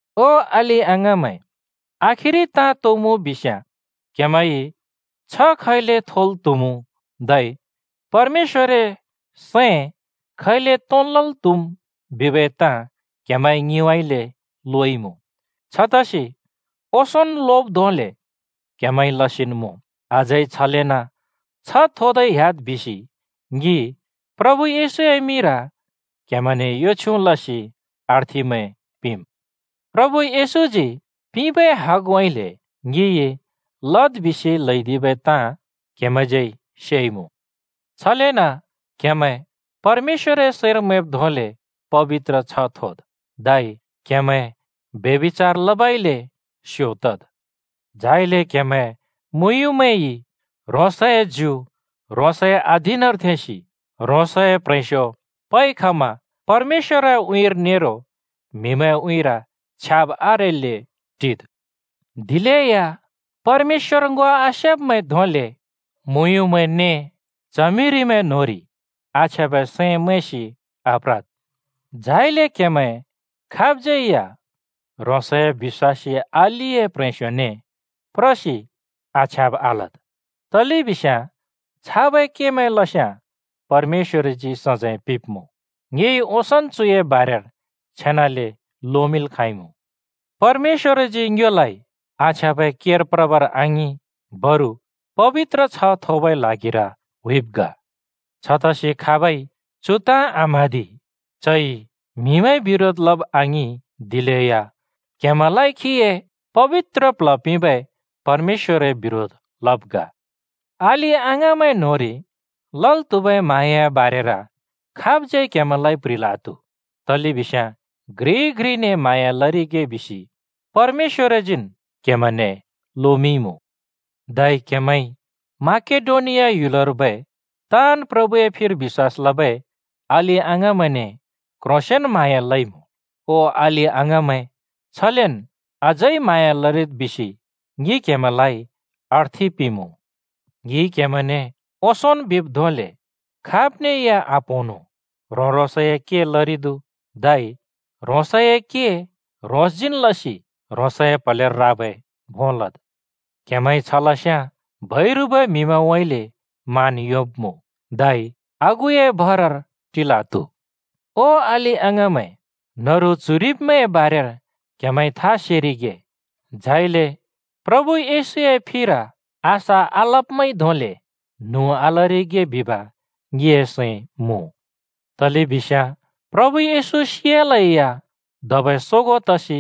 ओ अलि-अङाँमैं, आखिरि ताँ तो मुँ बिस्‍याँ, क्हेमैंइ छ्ह खैले थोल् त्हुमुँ धै परमेश्‍वरए सैं खैले तोंन् लल् त्हुम् बिबै ताँ क्हेमैंइ ङिउँइँले लोइमुँ। छतसि ओंसोंन् लोब् धोंले क्हेमैंइ लसिन् मुँ, अझै छलेन् छ्ह थोदै ह्‍याद् बिसि ङि प्रभु येशूए मिंर क्हेमैंने यो छ्युँ लसि अर्थिमैं पिंम्। प्रभु येशूजी पिंबै हगउँइँले ङिइ लद् बिसि ल्हैदिबै ताँ क्‍हेमैंज्यै सेइमुँ। छलेन क्‍हेमैं परमेश्‍वरए सैंर मैंब् धोंले पबित्र छ्ह थोद्, धै क्हेमैं फ्रें क्ल्योंब ने रण्डि-बाजी लबउँइँले स्यो तद्। झाइले क्‍हेमैं मुँयुँमैंइ ह्रोंसए ज्यु ह्रोंसए अधीनर थेंसि ह्रोंसए प्‍ह्रेंस्‍यो पइ खमा परमेश्‍वरए उँइँर नेरो म्हिमैंए उँइँर छ्याब आरेल्‍ले टिद्। दिलेया परमेश्‍वर ङो आसेब्‍मैं धोंले मुयुँमैं ने च्हमिरिमैं न्होंरि आछ्याँबै सैं मैंसि आप्रद्। झाइले क्हेमैं खाबज्‍यै या ह्रोंसए बिश्‍वासी अलिए प्‍ह्रेंस्‍योने प्रसि आछ्याँब आलद्। तलेबिस्याँ छाबै केमैं लस्याँ परमेश्‍वरजी सजैं पिंब्‍मुँ। ङिइ ओंसोंन् चुए बारेर छेनाले लोमिंल् खाँइमुँ। परमेश्‍वरजी ङ्योलाइ आछ्याँबै केर प्रबर आङिं, बरु पबित्र छ्ह थोबै ल्हागिर हुइब् ग। छतसि खाबइ चु ताँ आम्हाँदि, चइ म्हिमैंए बिरोध लब आङिं, दिलेया क्हेमैंलाइ खीए पबित्र प्ल्ह पिंबै परमेश्‍वरए बिरोध लब् ग। अलि-अङाँमैं न्होंरि लल् त्हुबै म्हाँयाए बारेर खाबज्यै क्हेमैंलाइ प्ह्रिल् आत्हु, तलेबिस्याँ घ्रिइ घ्रिने म्हाँया लरिगे बिसि परमेश्‍वरजीन् क्हेमैंने लोमिंइमुँ। धै क्हेमैंइ माकेडोनिया ह्‍युलर्बै ताँन् प्रभुए फिर बिश्‍वास लबै अलि-अङाँमैंने क्ह्रोंसेंन म्हाँया लइमुँ। ओ अलि-अङाँमैं, छलेन अझै म्हाँया लरिद् बिसि ङि क्हेमैंलाइ अर्थि पिंमुँ। ङिइ क्हेमैंने ओंसोंन् बिब् धोंले, खाब‍ने या आप्‍होंनु, ह्रों-ह्रोंसए के लरिद्, धै ह्रोंसए के ह्रोंसजीन् लसि ह्रोंसए प्‍हलेर राबै भों लद्। क्हेमैंइ छ लस्याँ बैरुबै म्हिमैंउँइँले मान योंब्मुँ धै आगुए भरर टिल् आत्हु। ओ अलि-अङाँमैं, न्‍हरु च्‍हुइरिब्‍मैंए बारेर क्‍हेमैंइ था सेरिगे झाइले प्रभु येशूए फिर आशा आलब्‍मैंइ धोंले न्हुँ आलरिगे बिब ङिए सैं मुँ। तलेबिस्याँ प्रभु येशू सियालेया धबै सोगों तसि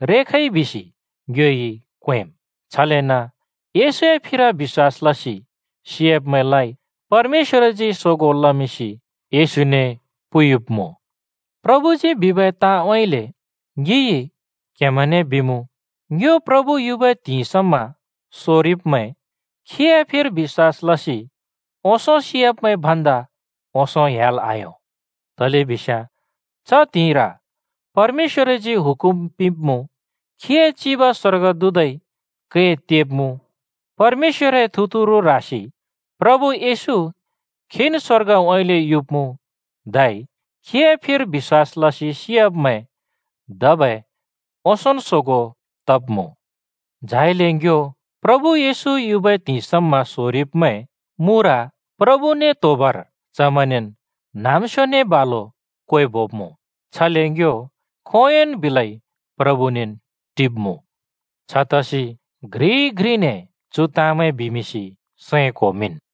रेखइ बिसि ङ्योइ क्वेंम्, छलेन येशूए फिर बिश्‍वास लसि सियाब्‍मैंलाइ परमेश्‍वरजी सोगों लमिंसि येशूने पुयुब्मुँ। प्रभुजी बिबै ताँउँइँले ङिइ क्‍हेमैंने बिमुँ, ङ्यो प्रभु युबै त्हिंइ समा सोरिब्मैं खीए फिर बिश्‍वास लसि ओंसों सियाब्‍मैं भन्दा ओंसों ह्‍याल् आयों, तलेबिस्याँ च त्हिंइर परमेश्‍वरजी हुकुम पिंब्‍मुँ, खीए चिब स्‍वर्गदूतइ कै तेब्‍मुँ, परमेश्‍वरए थुतुरु ह्रासि प्रभु येशू खीन् स्वर्गउँइँले युब्‍मुँ, धै खीए फिर बिश्‍वास लसि सियाब्मैं धबै ओंसोंन् सोगों तब्‍मुँ। झाइले ङ्यो प्रभु येशू युबै त्हिंइ समा सोरिब्मैं मुर प्रभुने त्होबर चमैंनेन् न्‍हाँम्‍स्योने बालु क्वेबोब्मुँ। छले ङ्यो खोंयोंन् बिलै प्रभुनेन् टिब्मुँ। छतसि घ्रिइ घ्रिने चु ताँमैं बिमिंसि सैं क्‍होमिंन्।